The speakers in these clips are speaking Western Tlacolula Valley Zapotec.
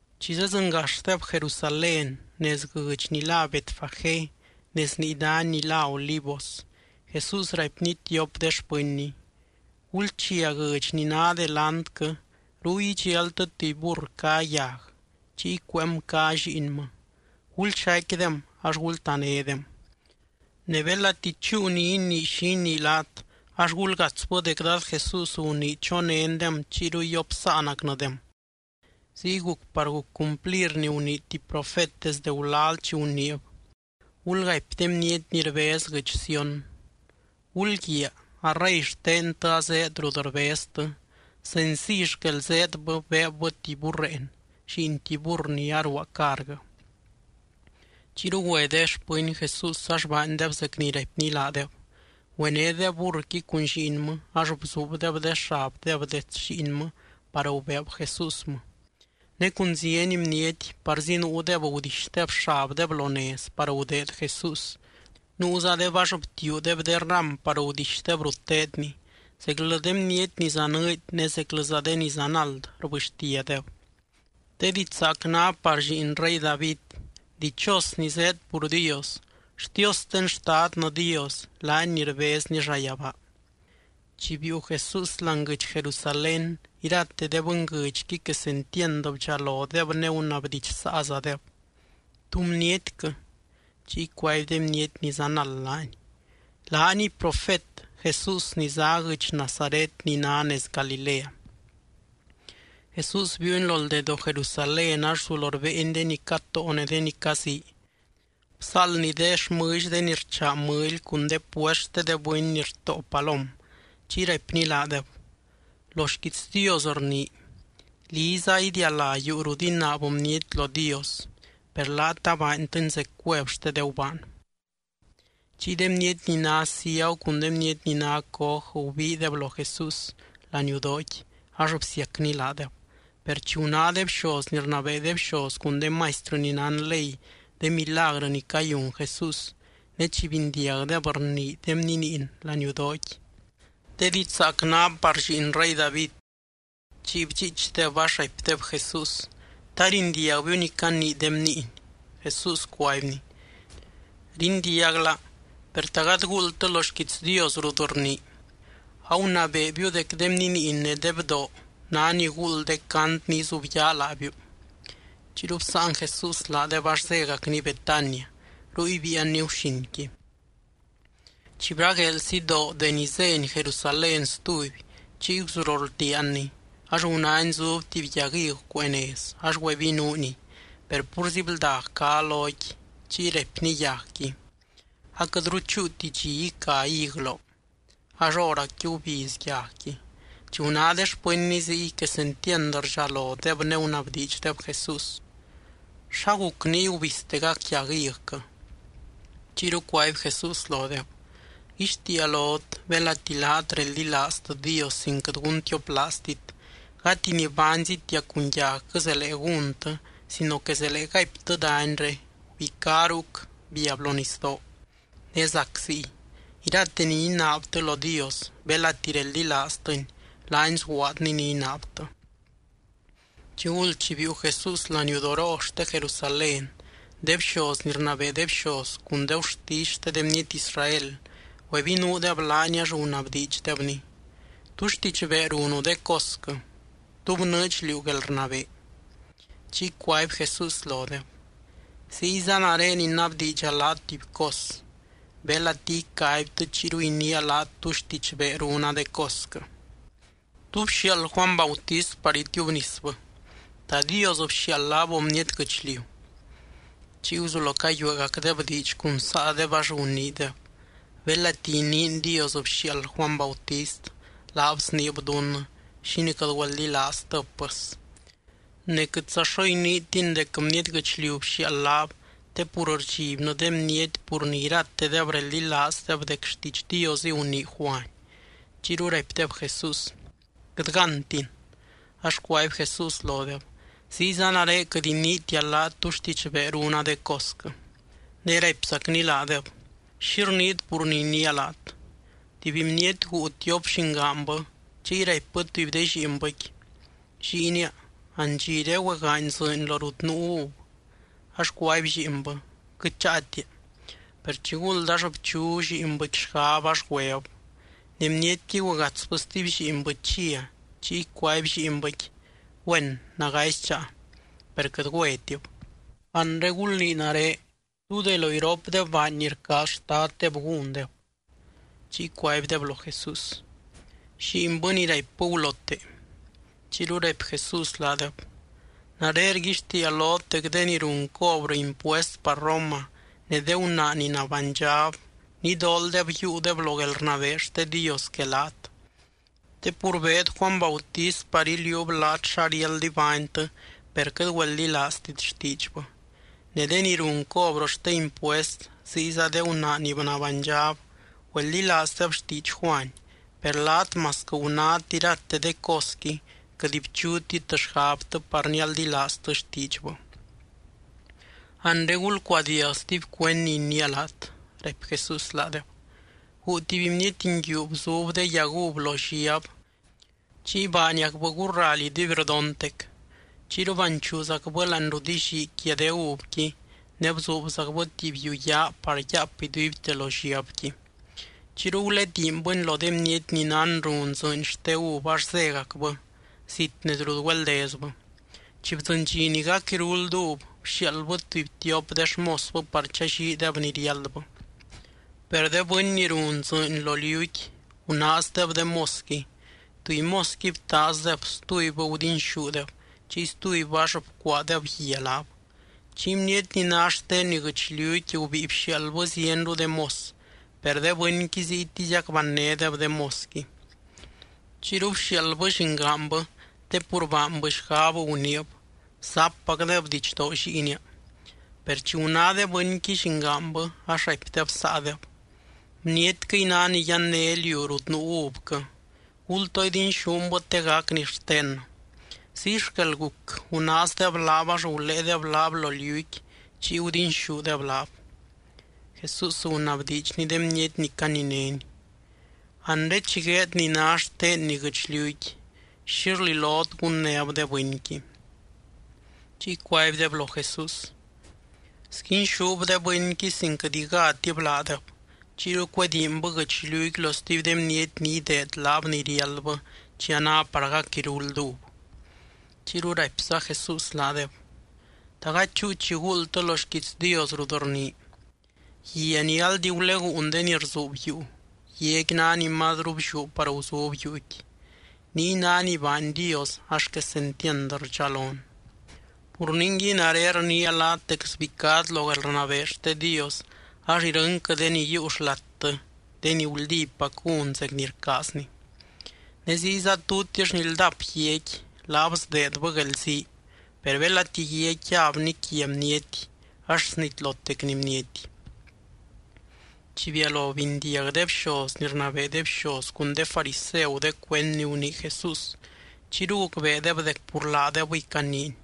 Chi zedzɨngaxdeb Jerusalén, nez guɨdx ni lá Betfagé nez nii dany ni lá Olivos, Jesús raipny tiop de xpɨnny: —Gulchia guɨdx ni ná delantquɨ. Ruy idxialtɨ tuby burr cá yag, chiy cueem cá lliinmɨ. Gulxaicquidem ax gultanédem. Ne belati chúu ni inii xi inii laat, ax gulgatsbɨ dec Dad Jesús gunii chonéndem chiyru yopsáanacnɨdem. Ziy guc par guc cumplir ni gunii tuby profet desde gulal chi guniib: Gulgaipy de bniety ni rbez guɨdx Sión: “Gulguiaa, a rey xtentɨ azéed rut rbeztɨ, senciy xquel zéedbɨ beebbɨ tuby burreen lliin tuby burr ni aruaa carguɨ.” Chiyru güe de xpɨny Jesús ax baandeb zec ni raipny laadeb. Güenédeb burrqui cun lliinmɨ ax bzuubdeb de xabdeb dets lliinmɨ, par gubeeb Jesúsmɨ. Ne cun zieny bniety, parzi nuudeb gudixdeb xabdeb lo nez par gudeed Jesús, nuuzadeb ax btiuudeb de ram par gudixdeb rut teedny. Zeclɨ de bniety ni zanɨɨdy ne zeclɨza de ni zanald rbɨxtiadeb: —¡De diidx zaac ná par Lliin rey David! ¡Dichos ni zéed pur Dios! ¡Xtiosten Xtadnɨ Dios, laany ni rbezny llayabaa! Chi biiu Jesús láani guɨdx Jerusalén, irate de bɨnguɨdxqui quesentiand bdxalodeb ne gunabdidxsaazadeb: —¿Tú bnietquɨ? Chiy cuaby de bniety ni zanald laany: —Laaniy profet Jesús ni zá guɨdx Nazaret ni ná nez Galilea. Jesús biiuny lo ldedoo Jerusalén, ax guzulo rbéeny de ni catóo ne de ni cazii. Bzáaldny de xmɨlly de ni rchaa mɨly cun de puest xte de bɨny ni rtóo palom. Chiy raipny laadeb: —Lo xquiits Dios rnii: “Liza idialá yuu rut inaab bniety lo Dios.” Per laat abaantɨni zec cuev xte de gubaan. Chiy de bniety ni ná ciagu cun de bniety ni ná coj gubiideb lo Jesús laniudooqui, ax bsiacny laadeb. Per chi guná de bxoz ni rnabee de bxoz cun de maistrɨ ni nán ley de milagrɨ ni cayun Jesús, ne chi bindiagdeb rnii de bniniin laniudooqui: “¡De diidx zaac ná par Lliin rey David!”, chiy bdxiichdeb ax raipdeb Jesús: —¿Ta rindiagbiu ni canii de bniiny? Jesús cuaibny: —Rindiagla. Per ¿ta gady guuldtɨ lo xquiits Dios rut rnii?: Agunabeebiu dec de bniniin ne de bdoo ná ni guuld de cant ni izubyaa laabiu. Chiyru bsáan Jesús laadeb ax zégacny Betania, ruy biianny guxinqui. Chi bragueel sidoo deni zény Jerusalén stuby, chiy guzulo rldiaanny. Ax gunány zub tuby yag hig cuee nez ax güebinuuniy, per púrzi bldag cá loqui. Chiy raipny yagqui: —¡Aquɨtru chúuti dxi ica hig loo! Ax hóracqui gubiz yagqui. Chi guná de xpɨnny ziy, quesentiand rdxalodeb ne gunabdiidxdeb Jesús: —¿Xaguc niy gubiztegac yag higquɨ? Chiyru cuaby Jesús lodeb: —Rguixtiia lot, belati laat reldilaaztɨ Dios sin quɨt guntioplaaztit, gati ni baanzitia cun yagquɨ zelee gúntɨ sino que zelee gaiptɨ danyre: “Gubicá ruc, biab lo nisdoo”, ne zac ziy. Irate ni inaabtɨ lo Dios, belati reldilaaztɨny, laany sguaadny ni inaabtɨ. Chiguld chi biiu Jesús laniudoroo xte Jerusalén, de bxoz ni rnabee de bxoz cun de gurtisy xte de bniety Israel, güebinuudeb laany ax gunabdiidxdebny: —¿Tú xtidxbee runu de cosquɨ? ¿Tú bnɨɨdx liú guelrnabee? Chiy cuaby Jesús lodeb: —Ziyza nare inabdiidxa laat tuby cos. Belati icaibtɨ chiyru iniia laat tú xtidxbee runa de cosquɨ. ¿Tú bxiaald Juany Bautist par itiubnisbɨ? ¿Ta Dios bxiaald laab o bniety guɨchliu? Chiy guzulo cayueegacdeb diidx cun saadeb, ax guniideb: —Belati iniin Dios bxiaald Juany Bautist, laab sniib dunnɨ: “¿Xínii quɨt güeldilaaztɨb, pɨs?” Ne quɨtza xo iniitin dec bniety guɨchliu bxiaald laab, te pur rdxibnɨ de bniety pur ni iratedeb reldilaaz dec xtiidx Diosɨy gunii Juany. Chiyru raipdeb Jesús: —Quɨt gántin. Ax cuaby Jesús lodeb: —Ziyza nare quɨt iniitia laat tú xtidxbee runa de cosquɨ. Ne raipzacny laadeb: —¿Xi rniit pur ni iniia laat? Tuby bniety guu tiop llingaanbɨ, chiy raipbɨ tuby de lliinbɨqui: “Lliinia, andxiré güegaany dzɨɨny lo rut nuu uv.” Ax cuaby lliinbɨ: “¡Quɨt cháatia!” Per chiguld ax bchu lliinbɨqui xgab, ax güeb. Ne bnietqui güegatsbɨ stuby lliinbɨ chia, chiy cuaby lliinbɨqui: “Güén, nagazi cháa.” Per quɨt güetib. Anre gulnii nare: ¿Tú de lo iropdeb baany ni rcaaz xtaddeb gúndeb? Chiy cuaibdeb lo Jesús: —Lliinbɨ ni raipbɨ gulote. Chiyru raipy Jesús laadeb: —Nare rguixtiia lot dec de ni run cobrɨ impuest par Roma, ne de gunaa ni nabánydxab, nidooldeb yiiudeb lo guelrnabee xte Dios que laat. Te pur beed Juany Bautist par iliuub laat xa riáld ibánytɨ, per quɨt güeldilaaztit xtiidxbɨ. Ne de ni run cobrɨ xte impuest ziyza de gunaa ni nabánydxab güeldilaazdeb xtiidx Juany. Per laat masquɨ gunát irate de cosqui, quɨt bchutit xgabtɨ par nialdilaaztɨ xtiidxbɨ. ’Anre gulcuadiag stuby cuend ni iniia laat —raipy Jesús laadeb—. Guu tuby bniety nguiu bzub de yag uv lo lliab, chiy baaniacbɨ gurraly iduibrdontec. Chiyru banchuuzacbɨ láani rut illii quia de uvqui, ne bzuubzacbɨ tuby yuu yaa par yaap iduibte lo lliabqui. ’Chiyru gulediinbɨni lo de bniety ni nán run dzɨɨny xte uv ax zégacbɨ, zit nez rut güeldezbɨ. Chi bdzɨny dxi ni gac iruld uv, bxiaaldbɨ tuby tiop de xmosbɨ par challiideb ni riáldbɨ. Per de bɨny ni run dzɨɨny lo liuqui, gunaazdeb de mosqui. Tuby mosqui btaazdeb, stubybɨ gudinxúdeb, chiy stubybɨ ax bcuaadeb guia laab. Chiy bniety ni ná xtenni guɨchliuqui gubíi bxiaaldbɨ zienru de mos, per de bɨnqui ziytiziac bannédeb de mosqui. ’Chiyru bxiaaldbɨ llingaanbɨ, te pur baanbɨ xgab, guniib: “Zappacdeb didxdoo lliinia.” Per chi guná de bɨnqui llingaanbɨ, ax raipdeb saadeb: “Bnietquɨy ná ni yanné liu rut nuu uvquɨ. Gultoo idinxúnbɨ te gacni xtennɨ.” Ziy xquel guc, gunaazdeb laab ax guléedeb laab lo liuqui chiy gudinxúdeb laab. Jesús gunabdiidxny de bniety ni caninény: —Anre chi gueed ni ná xtenni guɨchliuqui, ¿xi rlilot gunnéb de bɨnqui? Chiy cuaibdeb lo Jesús: —Sguinxúb de bɨnqui sin quɨt igátib laadeb, chiyru cuedínbɨ guɨchliuqui lo stuby de bniety ni ideed laab ni riáldbɨ chi a ná par gac iruld uv. Chiyru raipza Jesús laadeb: —¿Ta gady chúu chi guuldtɨ lo xquiits Dios? rut rnii: Guia ni aldi guleguun de ni rzuub yuu, guiaqui ná ni mazru blliú par guzub yuuqui. Niy ná ni baany Dios ax quesentiand rdxalon. Pur ningui nare rniia laat dec sbicát lo guelrnabee xte Dios ax irɨnquɨ de ni yiiu xlattɨ, de ni guldípac gún zec ni rcaazny. Ne ziyza tutix ni ldap guiaqui, laab sdeedbɨ guelzii. Per belati guiaqui yabni quia bniety ax snitlotecni bniety. Chi bialo bindiag de bxoz ni rnabee de bxoz cun de fariseu de cuend ni gunii Jesús, chiyru gucbeedeb dec pur laadebɨy caniiny.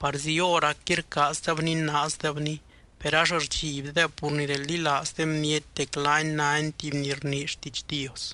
Parzi hóracqui rcaazdeb ninaazdebny, per ax rdxibdeb pur ni reldilaaz de bniety dec laany nány tuby ni rnii xtiidx Dios.